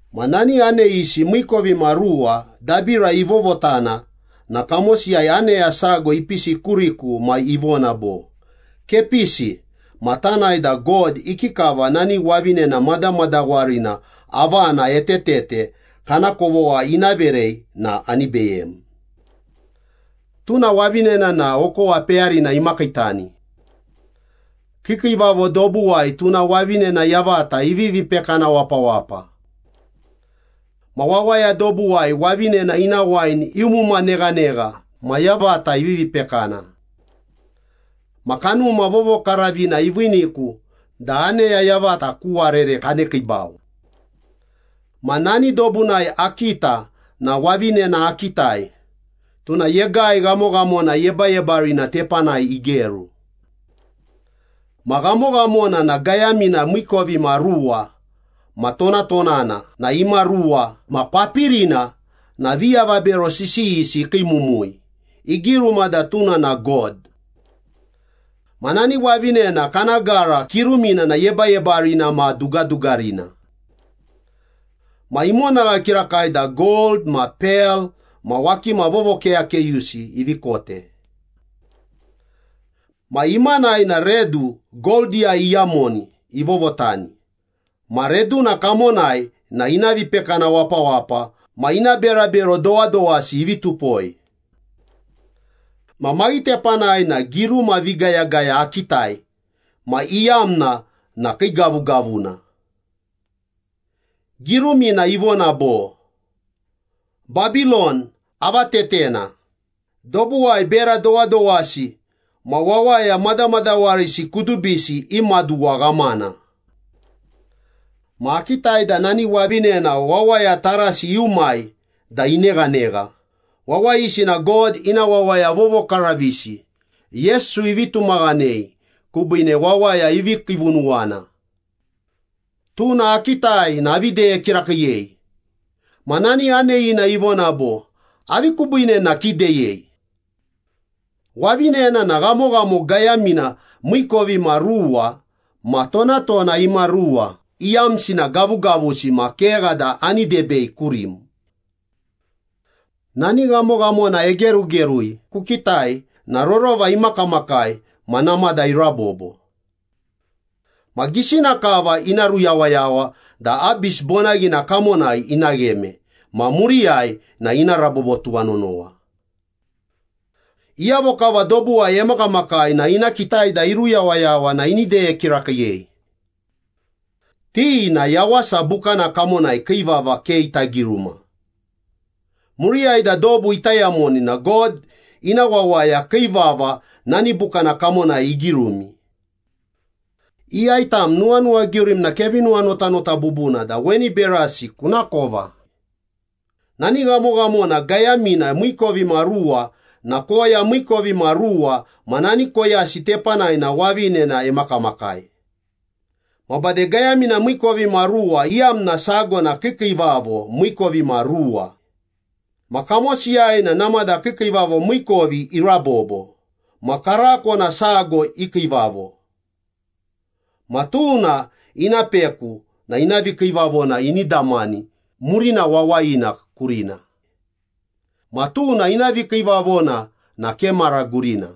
Ma nani aneyisi miikovimaruwa dabira ivovotana na kamosiyai aneya sago ipisi kuriku ma ivona bo, “Kepisi ma tanae da God ikikava nani wavinena madamadawarina avana etetete kana kovogha ina verei na ani beyem. Tuna wavinena na okowa peyarina imakiitani. Kiikiivavo dobuwai tuna wavinena yavata ivivi pekana wapawapa. Ma wawaya dobuwai wavinena ina wain iumuma neghanegha ma yavata ivivi pekana.” Ma Kanuma Vovokaravina iviiniku da aneya yavata ku warere kanekiibau. Ma nani dobunai akita na wavinena akitai, tuna yegai ghamoghamona yebayebarina tepanai igeru. Ma ghamoghamona na gayamina miikovimaruwa ma tonatonana na imaruwa ma kwapirina na viavabero sisiyisi ikiimumui, igiruma da tuna na god. Ma nani wavinena kana gara kirumina na yebayebarina ma dugadugarina ma imonagha kirakai da gold ma pel ma wakima vovokeyakeyusi ivi kote. Ma imanai na redu goldiyai iyamoni ivovotani ma reduna kamonai na ina vipekana wapawapa ma ina berabero dowadowasi ivi tupoi. Ma maghitepanai na giruma vigayagaya akitai ma iyamna na kiigavugavuna. Girumina ivona bo, “Babilon avatetena. Dobuwai bera dowadowasi ma wawaya madamadawarisi kudubisi i maduwa ghamana.” Ma akitai da nani wavinena wawaya tarasi iumai da ineghanegha, wawayisi na God ina wawaya vovokaravisi, Yesu ivi tumaghanei kubiine wawaya ivi kiivunuwana. Tuna akitai na avi deye kirakiiyei. Ma nani aneyina ivona bo, “Avi kubiine na kideyei? Wavinena ma ghamoghamona gayamina miikovimaruwa ma tonatona imaruwa iyamsi na gavugavusi ma kegha da ani debei kurim. Nani ghamoghamona egerugerui kukitai na rorova imakamakai ma namada irabobo. Ma gisina kava ina ruyawayawa da Abis bonaghina kamonai ina gheme ma muriyai na ina rabobo tuwanonowa. Iyavo kava dobuwai emakamakai na ina kitai da iruyawayawa na ini deye kirakiiyei. Ti na Yawasa Bukana kamonai kii vava ke ita giruma. Muriyai da dobu ita yamoni na God ina wawaya kii vava nani bukana kamonai igirumi.” “Iyai tam nuwanuwagiurim na kevi nuwanotanota bubuna da weni berasi kunakova. Nani ghamoghamona gayamina miikovimaruwa na koya miikovimaruwa ma nani koyasi tepanai na wavinena emakamakai. Ma bade gayamina miikovimaruwa iyamna sago na kiikiivavo miikovimaruwa. Ma kamosiyai na namada kiikiivavo miikovi irabobo, ma karako na sago ikiivavo. Ma tuna ina peku na ina vikiivavona ini damani murina wawayina kurina. Ma tuna ina vikiivavona na ke mara gurina.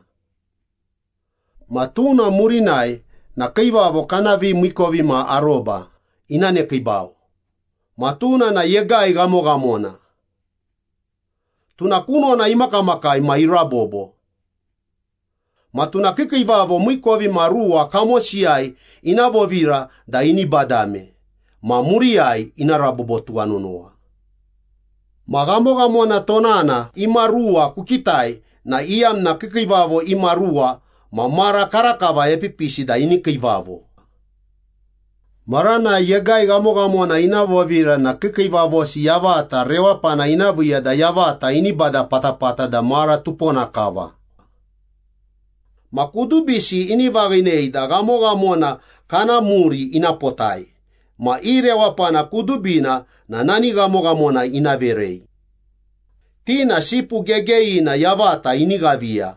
Ma tuna murinai na kiivavo kana vimiikovimaroba ina nekiibau, ma tuna na yegai ghamoghamona. Tuna kunona imakamakai ma irabobo. Ma tuna kiikiivavo miikovimaruwa kamosiyai, ina vovira da ini badame ma muriyai ina rabobo tuwanonowa.” “Ma ghamoghamona tonana imaruwa kukitai na iyamna kiikiivavo imaruwa ma mara karakava epipisi da ini kiivavo. Maranai yegai ghamoghamona ina vovira na kiikiivavosi yavata rewapana ina viiya da yavata ini bada patapata da mara tupona kava. Ma kudubisi ini vaghinei da ghamoghamona kana muri ina potai ma i rewapana kudubina na nani ghamoghamona ina verei. Ti na Sipu Gegeyina yavata ini ghaviya.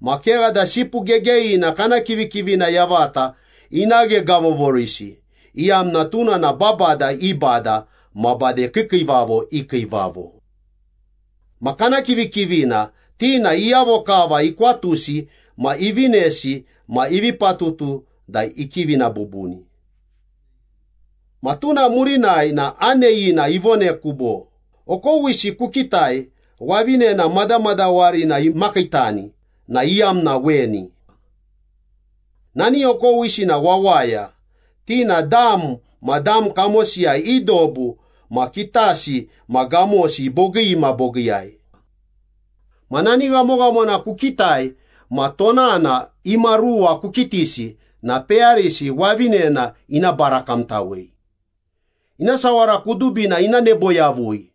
Ma kegha da Sipu Gegeyina kana kivikivina yavata ina ghegavovorisi, iyamna tuna na babada i Bada ma bade kiikiivavo i Kiivavo. Ma kana kivikivina, ti na iyavo kava ikwatusi ma ivinesi ma ivi patutu da ikivina bubuni.” Ma tuna murinai na aneyina ivoneku bo, “Okowisi kukitai, wavinena madamadawarina imakiitani na iyamna weni. Nani okowisi na wawaya, ti na dam ma dam kamosiyai, i dobu ma kitasi ma gamosi bogii ma bogiiyai. Ma nani ghamoghamona kukitai ma tonana imaruwa kukitisi na peyarisi wavinena ina barakamtawei. Ina sawara kudubina ina nebo yavui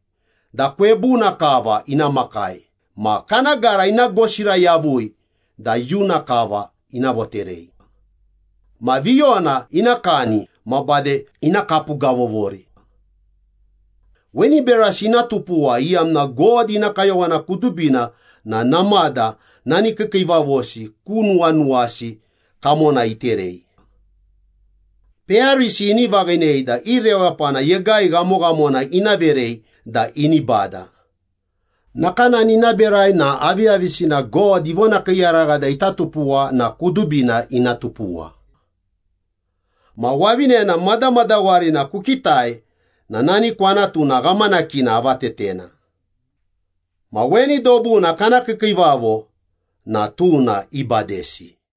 da kwebuna kava ina makai ma kana gara ina gosira yavui da iyuna kava ina voterei. Ma viyona ina kani ma bade ina kapugavovori. Weni berasi ina tupuwa iyamna God ina kayowana kudubina na namada nani kiikiivavosi ku nuwanuwasi kamona iterei. Peyarisi ini vaghinei da i rewapana yegai ghamoghamona ina verei da ini bada. Nakanani ina berai na aviyavisina God ivonakiiyaragha da ita tupuwa na kudubina ina tupuwa.” “Ma wavinena madamadawarina kukitai na nani kwanatuna ghamanakina avatetena. Ma weni dobuna kana kiikiivavo na tuna ibadesi.”